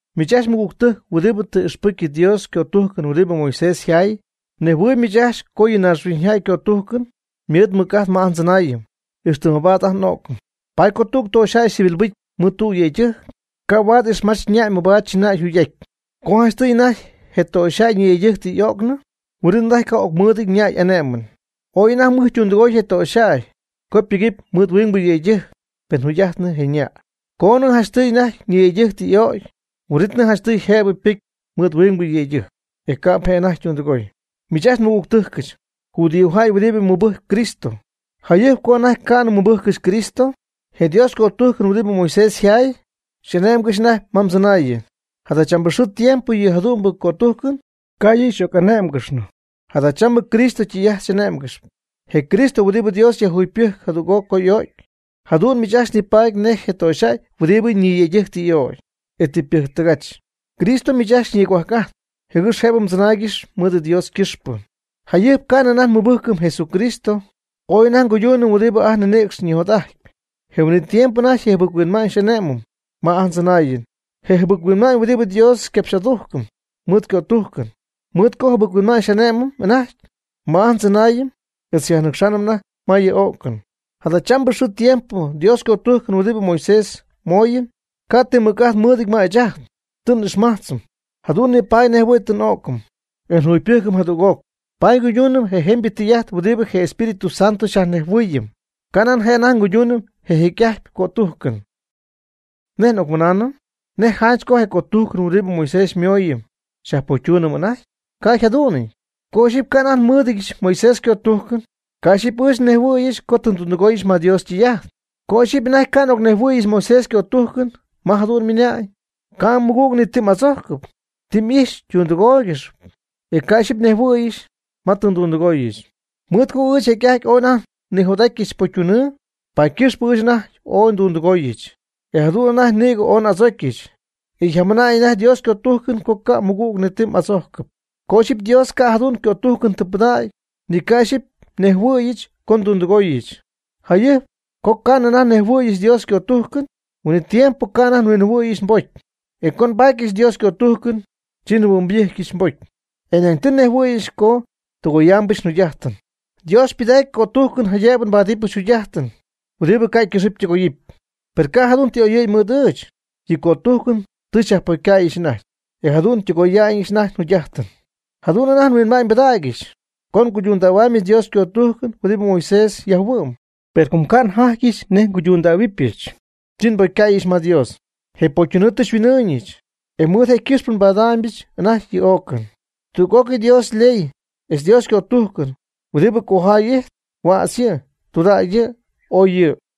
Miich ajcxy mɨgügtɨjc huɨdibɨ tɨ m'ixpɨcy Dios ycötujcɨn huɨdibɨ Moisés yjaay, mnejhuɨɨyb miich ajcxy co yɨ naaxhuiñyjäy ycötujcɨn ymɨɨd mɨc'ajt ma ajt ndzɨnaayɨn, ixtɨ mabaad anajty n'o'cɨm. Paady co tüg töxyjäy ycivilbɨcy mɨɨd tüg yëydɨjc, ca' huaad ixmach ñäy mabaad chɨna'y yjugy'aty. Co janchtɨy anajty je töxyjäy ñiyëydɨjc tɨ y'öcnɨ, huin'it anajty ca' ocmɨɨdɨñ ñäy y'ane'mɨn. Ooy anajty mɨj ytundɨgoy je töxyjäy co ypɨgɨpy mɨɨd huingbɨ yëydɨjc pen jugy'ajtnɨ je ñäy. Coonɨ janchtɨy anajty ñiyëydɨjc tɨ y'ögy, huin'itnɨ janchtɨy jëbɨ ypɨcy mɨɨd huingbɨ yëydɨjc, e ca'p je' anajty ytundɨgoy. Miich ajcxy nmɨgügtɨjcɨch, judíojäy huɨdibɨ mɨbɨjcp Cristo, jayɨjp co anajty ca'nɨ mmɨbɨjccɨxy Cristo, je Dios ycötujcɨn huɨdibɨ Moisés yjaay xy'ane'mgɨxp anajty ma mdzɨnaayɨn. Jadachambɨ xɨɨ tiempo yɨ jadu'mbɨ cötujcɨn ca' yɨ' xyjac'ané'mgɨxnɨ. Jadachambɨ Cristo ytɨy'ajt xy'ane'mgɨxp, je Cristo huɨdibɨ Dios yajjugypɨjc jadüg'oc co y'o'cy. Jadu'n miich ajcxy nipaady nej je töxyjäy huɨdibɨ ñiyëydɨjc tɨ y'ögy, e tɨ ypɨjctɨgach. Cristo miich ajcxy xyñigohuajc'ajtp, jɨgɨx jëbɨ mdzɨnaaygɨxy mɨɨd Dios ycɨxpɨ. Jayɨjp ca'nɨ anajty nmɨbɨjcɨm Jesucristo ooy anajty nguyduunɨm huɨdibɨ ajt nninïcx ñijot'ajt. Je huin'it tiempo anajty je jɨbɨc-huinma'ñ xy'ane'mɨm ma ajt ndzɨnaayɨn. Je' je' je jɨbɨc-huinma'ñ huɨdibɨ Dios xycapx'adujcɨm mɨɨd ycötujcɨn. Mɨɨd co jɨbɨc-huinma'ñ xy'ane'mɨm anajty ajt ma ndzɨnaayɨn etz xyajnɨcxaanɨm anajty ma yɨ o'cɨn. Jadachambɨ xɨɨ tiempo Dios ycötujcɨn huɨdibɨ Moisés xymooyɨm, ca' ti mɨc'ajt mɨɨdɨty ma ɨɨch ajt, tɨ n'ixmajtzɨm. Jadu'n nipaady nejɨhuɨ̈y tɨ n'o'cɨm, e njugypɨjcɨm jadüg'oc. Paady nguyduunɨm je jemybɨ tɨy'ajt huɨdibɨ je Espíritu Santo xyajnejhuɨɨyɨm. Canan je' anajty nguyduunɨm je jecy'ajtpy cötujcɨn. ¿Nej n'ocmɨnaanɨm? ¿Nej janch co je cötujcɨn huɨdibɨ Moisés xymooyɨm xyajpocytuunɨm anajty? Ca' yjadu'nɨty. Co ixyipy ca' anajty nmɨɨdɨdyɨch Moisés ycötujcɨn, ca' ixyipy ɨɨch tɨ nnejhuɨ̈yɨch co tɨ ndundɨgooyɨch ma Dios ytɨy'ajt. Co ixyipy anajty ca' n'ocnejhuɨ̈yɨch Moisés ycötujcɨn ma jadu'n ymɨnañ: “Ca' mmɨgüg ni ti m'adzojcɨpy.” Tɨ ixyipy ndundɨgooyɨch, e ca' ixyipy nejhuɨ̈yɨch ma tɨ ndundɨgooyɨch. Mɨɨd co ɨɨch jecy'ajty ooy anajty nnijot'atyɨch pocytunɨɨ, paady ycɨxpɨ ɨɨch anajty ooy ndundɨgooyɨch. E jadu'n anajty nïgɨ ooy n'adzocyɨch, e jamɨnam anajty Dios ycötujcɨn co ca' mɨgüg ni ti m'adzojcɨpy. Co ixyipy Dios ca' jadu'n cötujcɨn tɨ pɨdägy, ni ca' ixyipy njɨhuɨ'ñybɨcyɨch co ndundɨgooyɨch. Jayɨjp co ca'nɨ anajty nhuinjɨhuɨ̈yɨch Dios ycötujcɨn, huin'it tiempo ca' anajty njɨhuɨ'ñybɨcyɨch nbocy. E co nbatyɨch Dios ycötujcɨn, chi njɨhuɨ'nybɨjcyɨch nbocy, e nañ tɨ nejhuɨ̈yɨch co tɨgoyaamɨch njugy'ajtɨn. Dios ypɨdac ycötujcɨn jaydëbɨ nbáadɨbɨch jugy'ajtɨn huɨdibɨ ca' ycɨxɨpy ytɨgoyɨpy. Per ca' jadu'n tɨ oyɨ̈y mɨɨd ɨɨch. Yɨ cötujcɨn tɨ xyajpocycäyɨch anajty, e jadu'n tɨgoyaambɨch anajty njugy'ajtɨn. Jadu'n anajty huinma'ñ nmɨɨdɨdyɨch co nguydundähuaamybɨch Dios ycötujcɨn huɨdibɨ Moisés yjayhuɨ'm. Pero com ca' njatyɨch nej nguydundähuɨbyɨch, chi nbocycäyɨch ma Dios. Je pocytunɨɨ tɨ xyhuin'ɨɨñɨch, e mɨɨd je' ycɨxpɨ nbadaamybɨch anajty yɨ o'cɨn. Tüg'ócɨy Dios yley etz Dios ycötujcɨn huɨdibɨ cojay ijtp, huädz yɨ', tudägy yɨ', ooy yɨ'.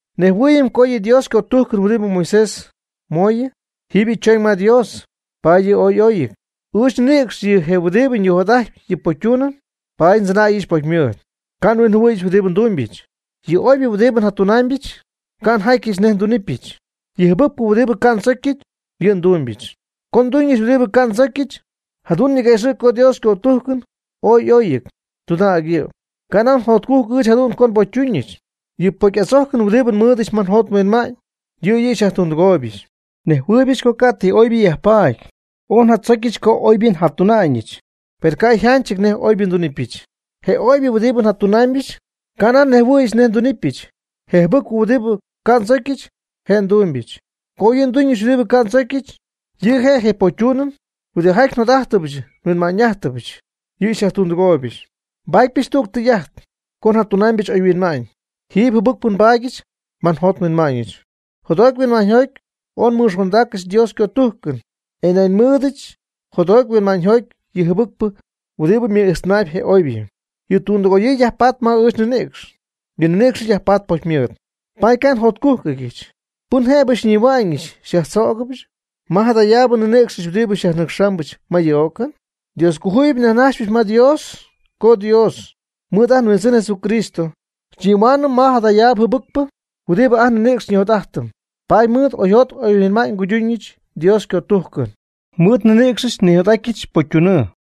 Nejhuɨɨyɨm co yɨ Dios ycötujcɨn huɨdibɨ Moisés xymooyɨm, jiiby yɨ' chooñ ma Dios, paady yɨ' ooy y'oyɨty. Ɨɨch nninïcx yɨ' je' huɨdibɨ nijot'ajtp yɨ pocytunɨɨ, paady ndzɨnäyɨch pocymɨɨd. Ca' nhuinjɨhuɨ̈yɨch huɨdibɨ ndumybɨch. Yɨ oybɨ huɨdibɨ njatunaamybɨch, ca' njatyɨch nej ndunɨpyɨch. Yɨ jɨbɨcpɨ huɨdibɨ ca' y'oychojcnɨty, yɨ' ndumbyɨch. Co nduñɨch huɨdibɨ ca' ndzocyɨch, jadu'n niquëxɨ̈gy co Dios ycötujcɨn ooy oy yɨ', tudägy yɨ'. Canan jotcujc ɨɨch jadu'n co nbocytuñɨch. Yɨ pocy'adzojcɨn huɨdibɨ nmɨɨdɨch ma njot nhuinma'ñ, yɨ' yɨ' xyajtundɨgooybɨch. Nejhuɨɨybɨch co ca' ti oybɨ yajpaady ma ɨɨch nninïcx. Ooy njatzocyɨch co oybɨ njatuna'ñɨch, per ca' njatyɨch nej oybɨ ndunɨpyɨch. Je oybɨ huɨdibɨ njatunaamybɨch, ca' njaty nej ndunɨpyɨch. Je jɨbɨcpɨ huɨdibɨ ca' ndzocyɨch, je' ndumybɨch. Co yɨ' nduñɨch huɨdibɨ ca' ndzocyɨch, yɨ' je' je pocytunɨɨ huɨdijaty njot'ájtɨbɨch nhuinma'ñ'ájtɨbɨch, yɨ' xyajtundɨgooybɨch. Nbaatypɨch tüg tɨy'ajt, co njatunaamybɨch oyhuinma'ñ, jiipy jɨbɨcpɨ nbaadyɨch ma njot nhuinma'ñɨch. Jotjoty huinma'ñyjoty ooy nmɨxondägyɨch Dios ycötujcɨn. E nañ mɨɨdɨch jotjoty huinma'ñyjoty yɨ jɨbɨcpɨ huɨdibɨ mɨ'ijxtɨnaayb je oybɨ. Yɨ tundɨgoyɨɨ yajpatp ma ɨɨch nninïcx. Yɨ nninïcxɨch yajpatp pocymɨɨd. Paady ca' njotcújcɨgyɨch. ¿Pɨn jëbɨ xyñihua'ñɨch xyajnïdzögɨbɨch ma jadayaab nninïcxɨch huɨdibɨ xyajnɨcxpɨch ma yɨ o'cɨn? Dioscojuyip nyajnajxypɨch ma Dios co Dios, mɨɨd ajt nHuindzɨn Jesucristo, xyñihuaanɨm ma jada jɨbɨcpɨ huɨdibɨ ajt nninïcx xyñi'jot'ajtɨm. Paady mɨɨd n'oyjot n'oyhuinma'ñ nguyduñɨch Dios ycötujcɨn. Mɨɨd nninïcxɨch nijot'atyɨch pocytunɨɨ.